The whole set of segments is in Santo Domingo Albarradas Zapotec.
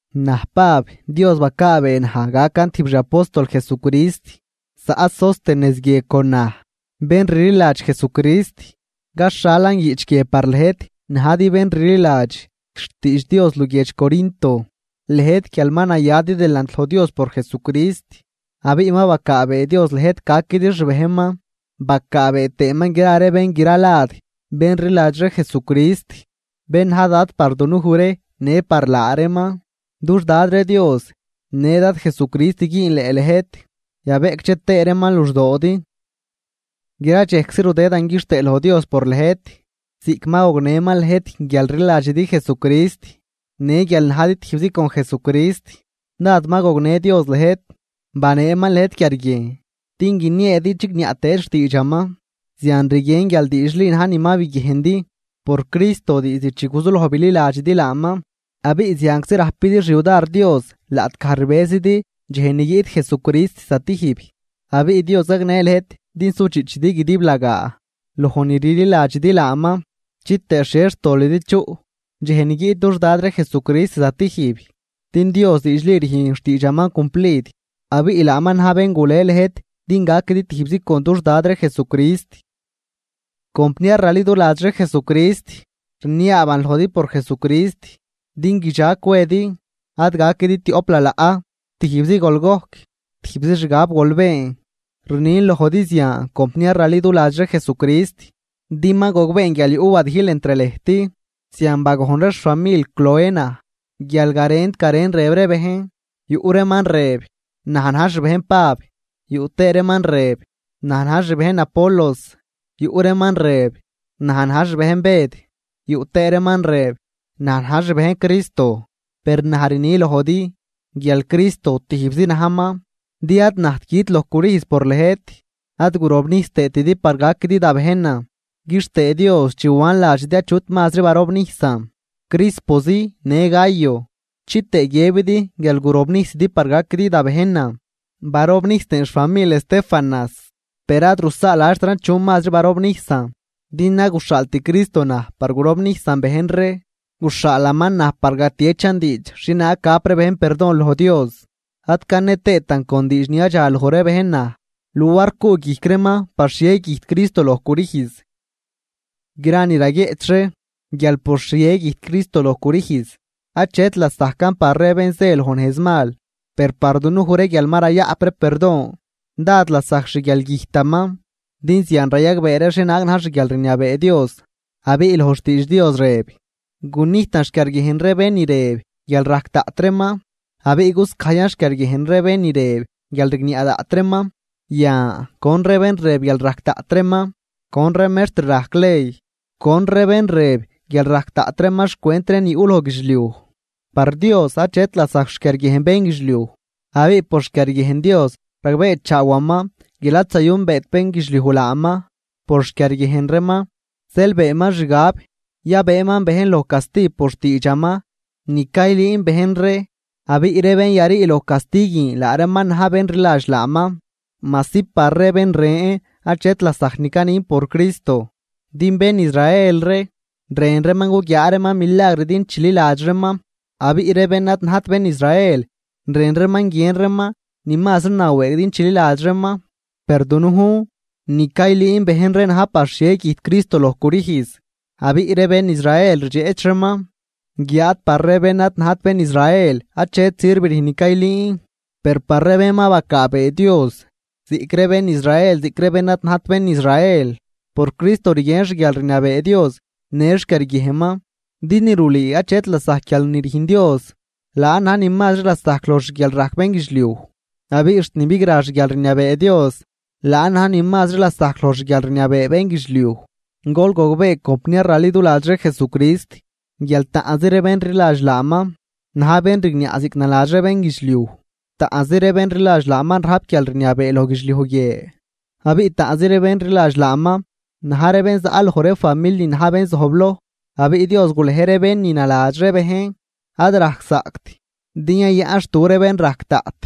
Naj Pab, Dios bacaabee naj gacan tijb xi apóstol Jesucrist. Zaꞌ Sóstenes guie con naj, bén rliladx Jesucrist. Caxhalan guiꞌch guie par lëjt najdi bén rliladx xtiidx Dios luguiedx Corinto, lëjt guial ma nayadi delant loj Dios por Jesucrist, abiꞌ ma bacaabee Dios lëjt gaquidi xbejnman bacaabee tëëman gra ree bén gra lad bén rliladx ree Jesucrist, bén na̱j Dad par dunuj ree në par laa reeman. Dux Dad ree Dios në Dad Jesucrist güünleꞌ lëjt, yabeꞌcdxe tëë reeman luxdoodi. Gra dxejczi rudëdan quixtëë loj Dios por lëjt ziꞌc ma gognëman lëjt guial rliladxidi Jesucrist. Në guial najdi tijbzi con Jesucrist dád ma gognë Dios lëjt, baneeman lëjt quiarguiejn din guinieedi chigniaꞌ tëedi xtiidxaman. Zian rguien guial diidxli na̱j ni ma biguiejndi por Cristo diizd chi guzuloj bililadxidi laaman. Abiꞌ zianczi rajpidi xyudar Dios laꞌtgaj rbëzidi dxej ni guiꞌt Jesucrist zatijb. Abiꞌ Dios gagnë lëjt din sudxiꞌchidi guidiblagaa loj ni rliladxidi laaman, chitëë xhie xtolidi chuꞌ dxej ni guiꞌt dux Dad ree Jesucrist zatijb. Din Dios diidxli rüjn xtiidxaman cumplid, abiꞌ laaman na̱j bén gule lëjt din gaquidi tijbzi con dux Dad ree Jesucrist. Compniar raliduladx ree Jesucrist, rniaaban lojdi por Jesucrist din guidxag cwedi, ad gaquidi tioꞌp lalaꞌ, tijbzi gol gojc, tijbzi xgab gol been. Rnin lojdi zian compniar raliduladx ree Jesucrist, din ma gogbeen guial yuꞌ wadijl entr lëjt, zian bagojn ree xfamil Cloé naj. Guial garent garen rëb ree bejn, yuꞌ reeman rëb: “Naj na̱j xbejn Pab”, yuꞌ tëë reeman rëb: “Naj na̱j xbejn Apolos”, yuꞌ reeman rëb: “Naj na̱j xbejn Bëd”, yuꞌ tëë reeman rëb: “Naj na̱j xbejn Cristo.” Per naj rni lojdi guial Cristo tijbzi najman, din ad najt güt loj crüjz por lëjt, ad gurobnijs tëëtidi par gaquidi da bejnan. Quixtëë Dios chi wan ladxidi achut mazri barobnijsan, Crispozi në Gayo. Chitëë guiëbidi guial gurobnijsidi par gaquidi da bejnan. Barobnijs tëën xfamil Estéfanas, per ad rusaaladxtran chu mazri barobnijsan. Din ad guxhaalt Cristo naj par gurobnijsan bejn ree, guxhaalaman naj par gatieꞌchan diidx xhienaag gap bejn perdon loj Dios. Ad cane tëëtan con diidx ni yadxaloj ree bejn naj luar cuꞌguijc reeman par xhie güjt Cristo loj crüjz. Gra ni raguieꞌch ree guial por xhie güjt Cristo loj crüjz, achet lasajcan par ree bén zë loj nejz mal. Per par dunuj ree guial ma rayaꞌp ree perdon, dád lasajc xguialgüjtaman din zian rayagbee ree xhienaag na̱j xguialrniabee Dios. Abiꞌ loj xtiidx Dios rëb: Gunijtan xquiarguiejn ree bén ni rëb guial rajc daꞌt reeman, abiꞌ guscajyan xquiarguiejn ree bén ni rëb guial rigniaꞌ daꞌt reeman. Yan, ¿con ree bén rëb guial rajc daꞌt reeman? ¿Con ree mextr rajc ley? ¿Con ree bén rëb guial rajc daꞌt reeman xcwent ree ni yuꞌ loj guidxliuj? Par Dios achet lasajc xquiarguiejn bénguidxliuj. Abiꞌ por xquiarguiejn Dios ragbeechaawaman guial ad zayünbeet bénguidxliuj laaman por xquiarguiejn reeman, zeel beenman xgab yabëëman bejn loj casti por xtiidxaman ni caylüün bejn ree. Abiꞌ ree bén yarii loj casti guin laa reeman na̱j bén rliladx laaman, majsi par ree ben ren achet lasajc ni canin por Cristo. Din bén Israel ree rën reeman guguiaa reeman milagr din chililadx reeman, abiꞌ ree bén ad najt bén Israel rën reeman guien reeman ni mazri nawëëg din chililadx reeman. Per dunujn ni caylüün bejn ree na̱j par xhie güjt Cristo loj crüjz, abiꞌ ree bén Israel rdxeꞌch reeman, guiáad par ree bén ad najt bén Israel achet sirv rüjn ni caylüün. Per par ree bén ma bacaabee Dios, ziꞌc ree bén Israel ziꞌc ree bén ad najt bén Israel, por Cristo rguien xguialrniabee Dios në xquiarguiejnman. Din ni rulüü achet lasajc guial ni rüjn Dios, laan na̱j ni mazri lasajc loj xguialrajc bénguidxliuj. Abiꞌ xt ni bigra xguialrniabee Dios laan na̱j ni mazri lasajc loj xguialrniabee bénguidxliuj. Gol gogbee compniar raliduladx ree Jesucrist guial taꞌnzi ree bén rliladx laaman na̱j bén rigniaꞌ ziꞌc naladx ree bénguidxliuj, taꞌnzi ree bén rliladx laaman rajp guialrniabee loj guidxliuj guie, abiꞌ taꞌnzi ree bén rliladx laaman na̱j ree bén za loj ree famil ni na̱j bén zojbloj. Abiꞌ Dios gulej ree bén ni naladx ree bejn ad rajczaꞌct din yayaꞌnxtu ree bén rajc daꞌt,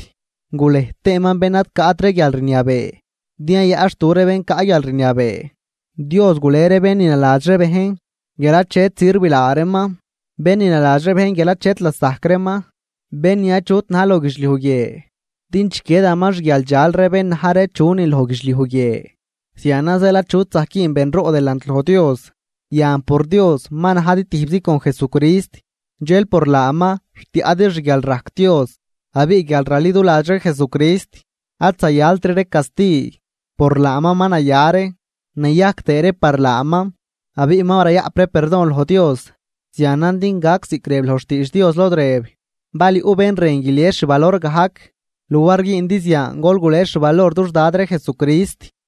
gulej tëëman bén ad caꞌt ree guialrniabee din yayaꞌnxtu ree bén caꞌ guialrniabee. Dios gule ree bén ni naladx ree bejn guial achet sirv laa reeman, bén ni naladx ree bejn guial achet lasajc reeman, bén ni achut na̱j loj guidxliuj guie din chiquiedaman xguialdxal ree bén na̱j ree chunin loj guidxliuj guie. Zianan zeel achut zajc güün benroꞌ delant loj Dios. Yan por Dios ma najdi tijbzi con Jesucrist, dxel por laaman rtiaꞌdi xguialrajc Dios. Abiꞌ guial raliduladx ree Jesucrist ad zayaltri ree casti, por laaman ma naya ree, nayajc tëë ree par laaman abiꞌ ma rayaꞌp ree perdon loj Dios. Zianan din gac ziꞌc rëb loj xtiidx Dios lod rëb: “Bal yuꞌ bén rën guilies xvalor gajc, luar güündi zian gol gules xvalor dux Dad ree Jesucrist.”